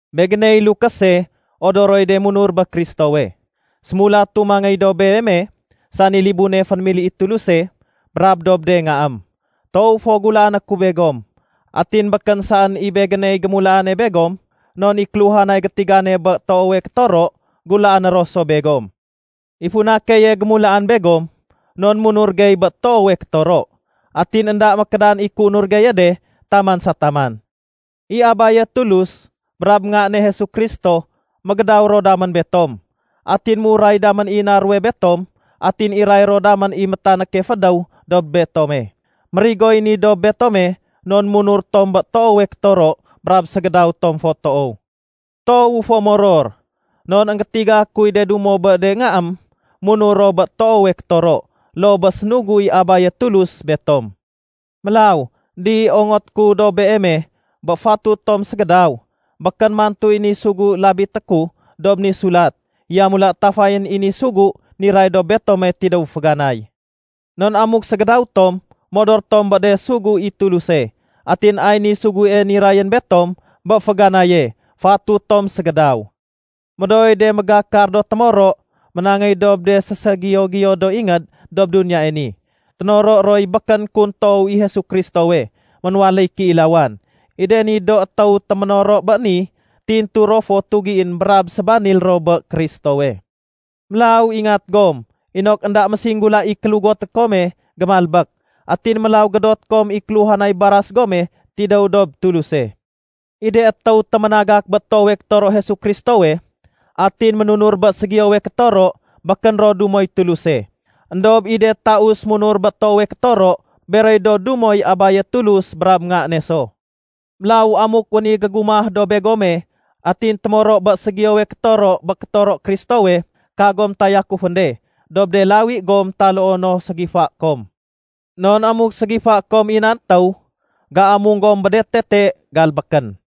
Begéney lukése odoroy de munur bé Kristowe. Sémulatu mangéy dob beeme, sani libune fénémili i Tuluse brab dob de ngaém. Toow fo gulaané ku begom. Atin békén saén i begéney gémulaane begom, non i kéluhanay gétigane bé toowe kétoro gulaané ro so begom. I funa keye gémulaan begom non munur gey bé toowe kétoro, atin énda mékédan i kéunur geye de taman sa taman. I Abaye Tulus brab Nga ne Jesu Kristo, mégédaw ro damén betom, atin méuray damén i na ruwe betom, atin iray ro damén i métanéke fédéw dob betome. Mérigoy ni dob betome non munur tom bé toowe kétoro brab ségédaw tom fo toow. Toowu fo moror non énggétiga kuy de dumo bé de ngaém munur ro bé toowe kétoro loo bé sénugu i Abaye Tulus betom. Mélaw, Di, ongoté ku dob beeme bé fatut tom ségédaw. Békén mantuy ni sugu labité ku dob ni sulat. Yamula tafayén i ni sugu niray dob betome tidéw féganay. Non amuk ségédaw tom, modor tom bé de sugu i Tuluse. Atin ay niy sugue nirayén betom bé féganaye: Fatut tom ségédaw. Médooy de mégakar do témoro ménangéy dob de séségiyo-giyo do ingéd dob duniyae ni. Ténoro roy békén kun toow i Jesu Kristowe ménwaléy kéilawan. I de ni do étéw téménoro bé ni, tintu ro fo tugién brab sébanil ro bé Kristowe. Mélaw ingat gom inok énda mésinggula i kélugoté kome gémalbék. Atin mélaw gédoté kom i kéluhanay baras gome tidéw dob Tuluse. I de étéw téménagak bé toowe kétoro Jesu Kristowe atin ménunur bé ségiyowe kétoro, békén ro dumoy Tuluse. Endob i de taus munur bé toowe kétoro, beroy do dumoy Abaye Tulus brab Nga ne so. Mélaw amuk wén i gégumah dob begome atin témoro bé ségiyowe kétoro bé kétoro Kristowe, kagom tayakufén de dob de lawi gom taloo no ségifaé kom. Non amuk ségifaé kom i nan étéw, géamung gom bé de tete galbékén.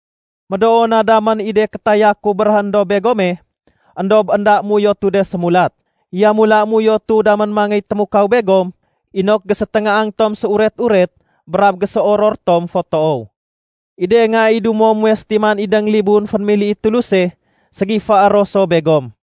Médoo na damén i de kétaya ku béréhén dob begome, éndob énda méuyotu de sémulat. Yamula méuyotu damén mangéy témukaw begom inok géséténgaang tom séuret-uret brab géséoror tom fo toow. I de nga i dumo muwe sétiman idéng libun fénémili i Tuluse, ségifaé ro so begom.